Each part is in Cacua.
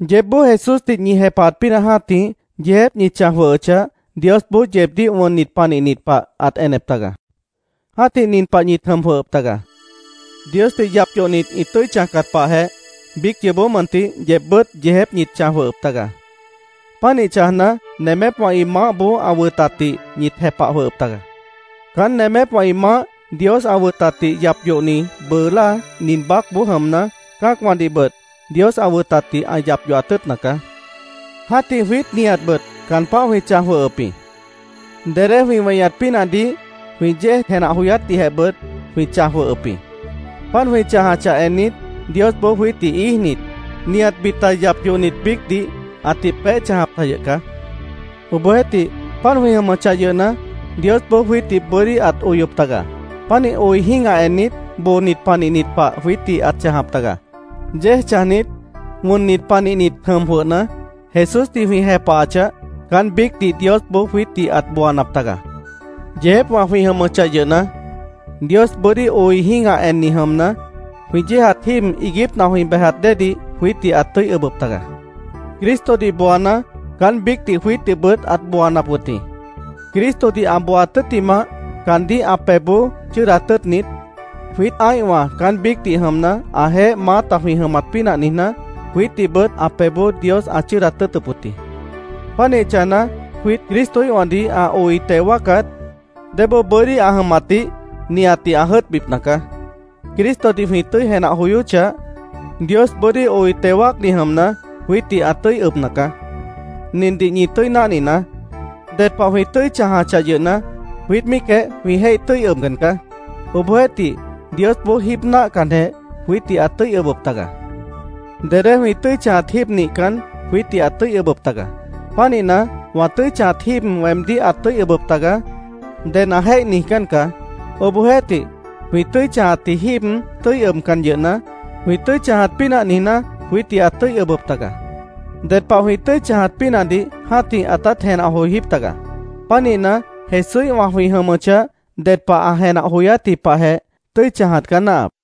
Yeébboó Jesúsdih ñi jepahat pínah jã́tih, yeejép ñi chãj jwʉhʉchah, Diosboó yeebdíh wʉnnit panihnit pah ãt enep taga. Jã́tih nin pah ñit jʉm jwʉhʉp taga: Diosdih yap yohnit ĩ tʉ́i chãjcat pahjeh, biíc yoobó mʉntih yeebbʉ́t yeejép ñit chãj jwʉhʉp taga. Pánih chãjna, nemépwã ĩ maáhboó ã wʉtatdih ñit jepah jwʉhʉp taga. Caán nemépwã ĩ maáh Dios ã wʉtatdih yap yohni bʉʉ láa nin baácboó jʉmna, cã́acwãdihbʉt Dios ã wʉtatdih ã yap yohat tʉ́ʉtna caá. Jã́tih jwiít nihatbʉt caan páh jwĩ chãj jwʉhʉp jĩ. Dedé jwĩ weñat pínahdih, jwĩ yéej jenah joyátdihjehbʉt jwĩ chãj jwʉhʉp jĩ. Páant jwĩ chãjachah ennit, Diosboó jwiítdih íijnit, nihat bita yap yohnit biícdih, ãtih peéh chãjap ta yʉh caá. Obohjeéhtih, páant jwĩ jʉmʉchah yʉhna, Diosboó jwiítdih bʉ́dí ãt oyop taga. Pánih oi jĩ́gah ennit, boonit panihnit pah jwiítdih ãt chãjap taga. Yéej chãjnit, wʉnnit panihnit jʉm jwʉhna, Jesúsdih jwĩ jepahachah, caán biícdih Diosboó jwiítdih ãt booanap taga. Yeejépwã jwĩ jʉmʉchah yʉhna, Dios bʉ́dí oi jĩ́gah enni jʉmna, jwĩ yéejat jíib iiguípna jwĩ bejat déedih jwiítdih ãt tʉ́i ʉbʉp taga. Cristodih booana, caán biícdih jwiítdihbʉt ãt booanap wʉt jĩ. Cristodih ã booaat tʉ́ttimah, caandíh ã pebhboó chʉ́ʉdat tʉ́ʉtnit, jwiít ã́ihwã caán biícdih jʉmna, ãjeéh maáta jwĩ jʉmat pínah niijná, jwiítdihbʉt ã pebhboó Dios ãt chʉ́ʉdat tʉ́ʉtʉp wʉt jĩ. Pánih chãjna, jwiít Cristoíhwãdih ã oi teo wáacat, débóo bʉ́dí ã jʉmatdih nihatdih ã jʉ́ʉtbipna caá. Cristodih jwĩ tʉ́i jenah joyóchah, Dios bʉ́dí oi teo wáacni jʉmna, jwiítdih ã tʉ́i ʉbna caá. Nindih ñi tʉ́i náhninaá: Ded pah jwĩ tʉ́i chãjachah yʉhna, jwiít míicjeh jwĩ jéih tʉ́i ʉbcan caá. Obohjeéhtih, Diosboó jíib náahcanjeh jwiítdih ãt tʉ́i ʉbʉp taga. Dedé jwĩ tʉ́i chãjat jíib nihcan, jwiítdih ãt tʉ́i ʉbʉp taga. Pánihna, “Wã tʉ́i chãjat jíib weemdíh ãt tʉ́i ʉbʉp taga”, ded ã jéih niijcán caá. Obohjeéhtih, jwĩ tʉ́i chãjatji jíib tʉ́i ʉbcan yʉhna, jwĩ tʉ́i chãjat pínah niijná, jwiítdih ãt tʉ́i ʉbʉp taga. Ded pah jwĩ tʉ́i chãjat pínahdih jã́tih ãtát jenah joijíp taga. Pánihna, Jesúíhwã jwĩ jʉmʉchah, ded pah ã jenah joyátji pahjeh, tʉ́i chãjat caá náahap.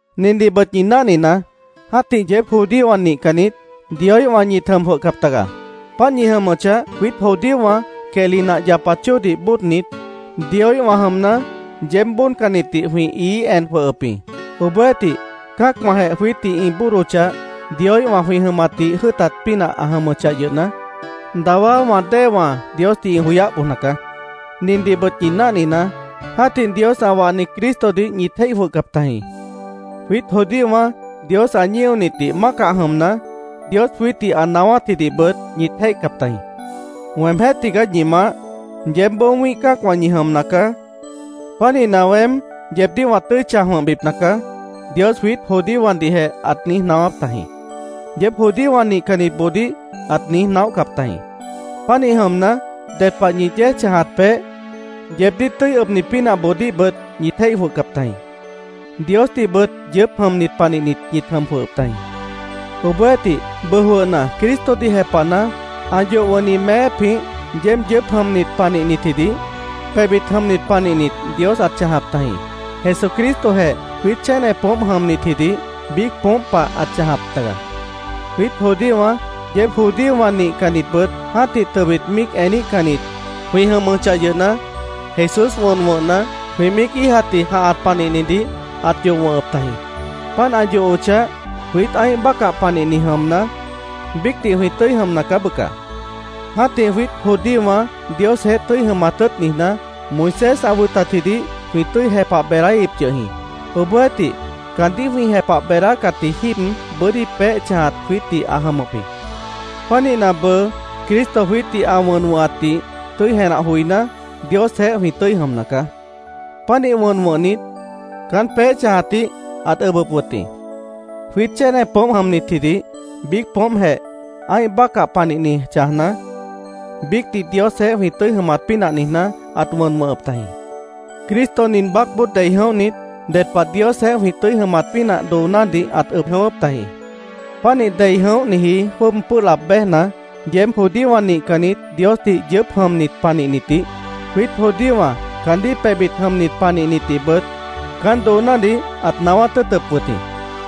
Nindihbʉt ñi náhninaá: Jã́tih yeéb judíowã nihcannit, Dioíhwã ñit jʉm jwʉhcap taga. Páant ñi jʉmʉchah, jwiít judíowã quehli nah yapat chóodih bóodnit, Dioíhwã jʉmna, yeéb bóodcannitdih jwĩ ií en jwʉhʉp jĩ. Obohjeéhtih, cã́acwãjeh jwiítdih ĩ bóodochah, Dioíhwã jwĩ jʉmatdih jʉ́ʉtat pínah ã jʉmʉchah yʉhna, dawá wã déewã Diosdih ĩ joyáh bojna caá. Nindihbʉt ñi náhninaá: Jã́tih Dios ã wahni Cristodih ñit jéih jwʉhcap tajĩ. Jwiít judíowã Dios ã ñíonitdih mácah jʉmna, Dios jwiítdih ã naáwátjidihbʉt ñit jéihcap tajĩ. “Weemjéh tigaá ñi Maáh. Yeébboó wĩ́ih cã́acwã ñi jʉmna caá. Pánihna, weém yeebdíh wã tʉ́i chãj wʉ̃hbipna caá”, Dios jwiít judíowãdihjeh ãt niíj naáwáp tajĩ. Yeéb judíowã nihcannitboodíh ãt niíj naóhcap tajĩ. Pánih jʉmna, ded pah ñi yéej chãjat peéh, yeebdíh tʉ́i ʉbni pínahboodíhbʉt ñit jéih jwʉhcap tajĩ. Diosdihbʉt yʉʉ́p jʉmnit panihnit ñit jʉm jwʉhʉp tajĩ. Obohjeéhtih, bʉʉ jwʉhna, Cristodih jepahna, ã yoh wʉ̃hni meépjĩh yeéb yʉʉ́p jʉmnit panihnitjidih, pebhbit jʉmnit panihnit Dios ãt chãjap tajĩ. Jesucristojeh jwiít chéne poómp jʉmnitjidih biíc poómp pah ãt chãjap taga. Jwiít judíowã, yeéb judíowã nihcannitbʉt jã́tih tʉbit míic eníhcannit jwĩ jʉmʉchah yʉhna, Jesús wʉn wʉ̃hna, jwĩ míic íijatji jãhat panihnidih, ãt yoh wʉ̃hʉp tajĩ. Páant ã yohochah, jwiít ã́ih bácah panihni jʉmna, biícdih jwĩ tʉ́i jʉmna caá, bʉca. Jã́tih jwiít judíowã Diosjeéh tʉ́i jʉmat tʉ́ʉt niijná, Moisés ã wʉtatjidih jwĩ tʉ́i jepah beedáíhip yʉh jĩ. Obohjeéhtih, caandíh jwĩ jepah beedácatji jíib bʉ́dí peéh chãjat jwiítdih ã jʉmʉp jĩ. Pánihna, bʉʉ Cristo jwiítdih ã wʉn wʉ̃hatdih tʉ́i jenah joiná, Diosjeéh jwĩ tʉ́i jʉmna caá. Pánih wʉn wʉ̃hnit, caán peéh chãjatdih ãt ʉbʉp wʉt jĩ. Jwiít chéne poómp jʉmnitjidih biíc poómpjeh, ã́ih bácah panihni chãjna, biícdih Diosjeéh jwĩ tʉ́i jʉmat pínah niijná, ãt wʉn wʉ̃hʉp tajĩ. Cristo nin baácboó dei jʉ̃óhnit, ded pah Diosjeéh jwĩ tʉ́i jʉmat pínah doonádih ãt ʉb jʉ̃ʉ́wʉ́p tajĩ. Pánih dei jʉ̃óhniji jwʉ́ʉb pʉ́ʉh laab béjna, yeéb judíowã nihcannit Diosdih yʉʉ́p jʉmnit panihnitdih, jwiít judíowã caandíh pebhbit jʉmnit panihnitdihbʉt, caán doonádih ãt naáwát tʉ́ʉtʉp wʉt jĩ.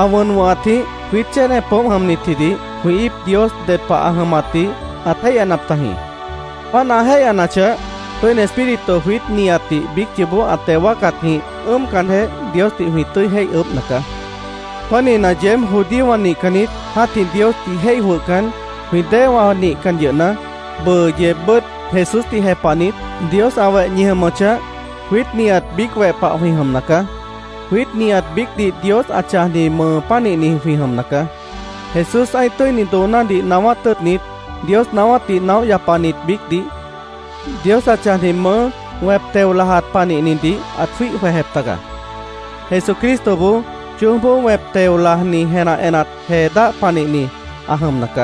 Ã wʉn wʉ̃hatjĩh jwiít chéne poómp jʉmnitjidih jwĩ íip Dios ded pah ã jʉmatdih ãt jéihyanap tajĩ. Páant ã jéihyanachah, Tʉ́ini Espíritu jwiít nihatdih biíc yoobó ã teo wáacatjĩh ʉ́ʉmcanjeh Diosdih jwĩ tʉ́i jéih ʉʉ́bhna caá. Pánihna, yeéb judíowã nihcannit, jã́tih Diosdih jéih jwʉhcan, jwĩ déewã nihcan yʉhna, bʉʉ yeebbʉ́t Jesúsdih jepahnit, Dios ã weh ñi jʉmʉchah, jwiít nihat biíc weh pah jwĩ jʉmna caá. Jwiít nihat biícdih Dios ã chãjni mʉʉ pánihni jwĩ jʉmna caá. Jesús ã́ih tʉ́ini doonádih naáwát tʉ́ʉtnit, Dios naáwátdih naóh yapanit biícdih, Dios ã chãjni mʉʉ́ wẽp teo lajat panihnidih ãt jwíih jwejep taga. Jesucristoboó choójboó wẽp teo lajni jenah enat jee dáh panihni ã jʉmna caá.